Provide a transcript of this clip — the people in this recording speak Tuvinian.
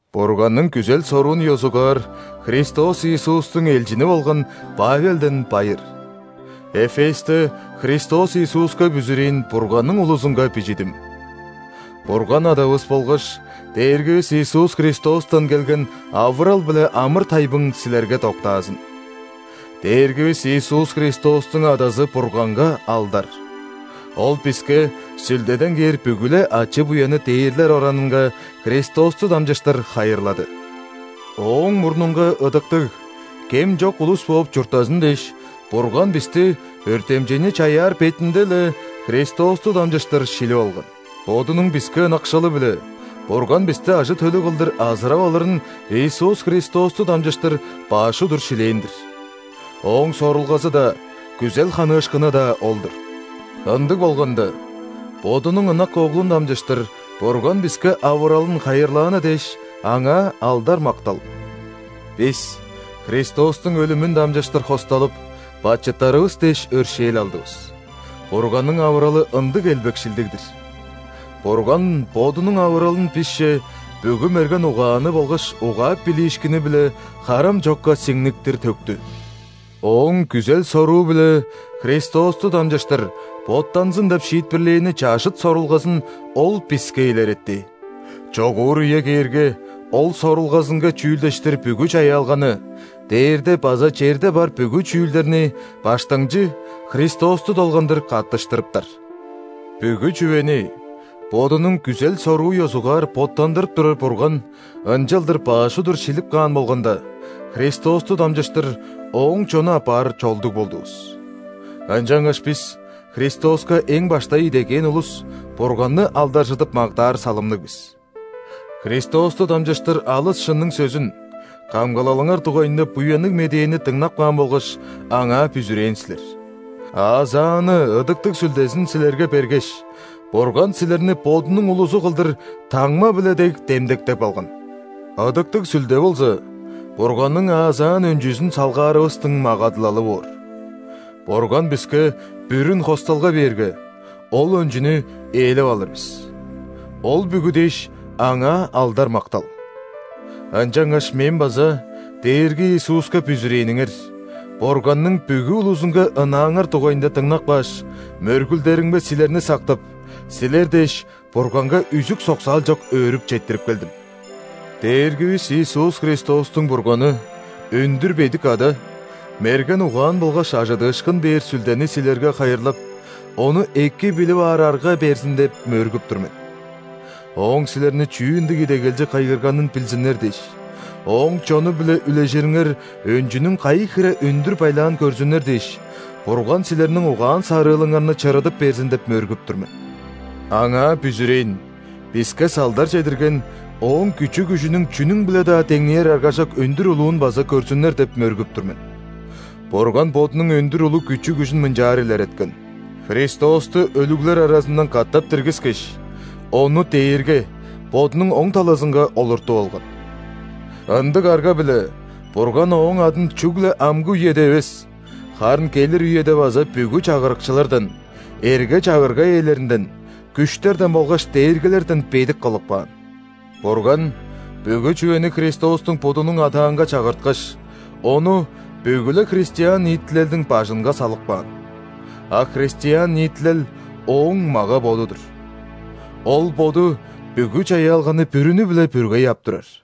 Бурганның күзел-соруун ёзугаар Христос Иисустуң элчини болган Павелден байыр. Эфесте Христос Иисуска бүзүрээн Бурганның улузунга бижидим. Бурган Адавыс болгаш Дээргивис Иисус Христостан келген авырал биле амыр-тайбың силерге доктаазын! Дээргивис Иисус Христостуң Адазы Бурганга алдар! Ол биске Сүлдеден кээр бүгү-ле ачы-буянны дээрлер оранынга Христосту дамчыштыр хайырлады. Ооң мурнунга ыдыктыг, кем чок улус бооп чурттазын дээш, Бурган бисти өртемчейни чаяар бетинде-ле Христосту дамчыштыр шилип алган. Бодунуң биске ынакшылы-биле Бурган бисти ажы-төлү кылдыр азырап алырын Иисус Христосту дамчыштыр баш удур шилээн-дир. Ооң сорулгазы-даа, күзел ханыышкыны-даа ол-дур! Ындыг болганда, Бодунуң ынак Оглун дамчыштыр Бурган биске авыралын хайырлааны дээш, Аңаа алдар-мактал! Бис Христостуң өлүмүн дамчыштыр хосталып, бачыттарывыс дээш өршээл алдывыс. Бурганның авыралы ындыг элбекшилдиг-дир! Бурган Бодунуң авыралын бисче бүгү мерген угааны болгаш угаап билиишкини-биле харам чокка сиңниктир төктү. Ооң күзел-соруу-биле Христосту дамчыштыр боттанзын деп шиитпирлээни чажыт сорулгазын Ол биске илеретти: чогуур үе кээрге, Ол сорулгазынга чүүлдештир бүгү чаяалганы – дээрде база черде бар бүгү чүүлдерни Баштыңчы Христосту долгандыр каттыштырыптар. Бүгү чүвени Бодунуң күзел-соруу ёзугаар боттандырып турар Бурган ынчалдыр баш удур шилип каан болганда, Христосту дамчыштыр Ооң чону апаар чолдуг болдувус. Ынчангаш бис – Христоска эң баштай идегээн улус – Бурганны алдаржыдып мактаар салымныг бис. Христосту дамчыштыр алыс шынның сөзүн – камгалалыңар дугайында Буянныг Медээни дыңнап каан болгаш, Аңаа бүзүрээн силер. Аазааны Ыдыктыг Сүлдезин силерге бергеш, Бурган силерни Бодунуң улузу кылдыр таңма-биле дег демдектеп алган. Ыдыктыг Сүлде болза Бурганның аазаан өнчүзүн салгаарывыстың магадылалы боор. Бурган биске бүрүн хосталга бээрге, ол өнчүнү ээлеп алыр бис. Ол бүгү дээш, Аңаа алдар-мактал! Ынчангаш мен база Дээрги Иисуска бүзүрээниңер, Бурганның бүгү улузунга ынааңар дугайында дыңнап кааш, мөргүлдеримге силерни сактып, силер дээш, Бурганга үзүк-соксаал чок өөрүп четтирип келдим. Дээргивис Иисус Христостуң Бурганы – өндүр бедик Ада мерген угаан болгаш ·ажыдыышкын бээр Сүлдени силерге хайырлап, Ону эки билип аар арга берзин деп мөргүп тур мен. Ооң силерни чүү ындыг идегелче кыйгырганын билзиннер дээш, Ооң чону-биле үлежириңер өнчүнүң кайы хире өндүр байлаан көрзүннер дээш, Бурган силерниң угаан-сарыылыңарны чырыдып берзин деп мөргүп тур мен. Аңаа бүзүрээн биске салдар чедирген Ооң күчү-күжүнүң чүнүң-биле-даа деңнээр аргажок өндүр улуун база көрзүннер деп мөргүп тур мен. Бурган Бодунуң өндүр улуг күчү-күжүн мынчаар илереткен: Христосту өлүглер аразындан катап диргискеш, Ону дээрге, Бодунуң оң талазынга, олуртуп алган. Ындыг арга-биле Бурган Ооң адын чүгле амгы үеде эвес, харын келир үеде база бүгү чагырыкчылардан, эрге-чагырга ээлеринден, күштерден болгаш дээргилерден бедик кылып каан. Бурган бүгү чүвени Христостуң будунуң адаанга чагырткаш, Ону бүгү-ле христиан ниитилелдиң бажынга салып каан. А христиан ниитилел – Ооң мага-боду-дур. Ол Боду бүгү чаяалганы бүрүнү-биле бүргей ап турар.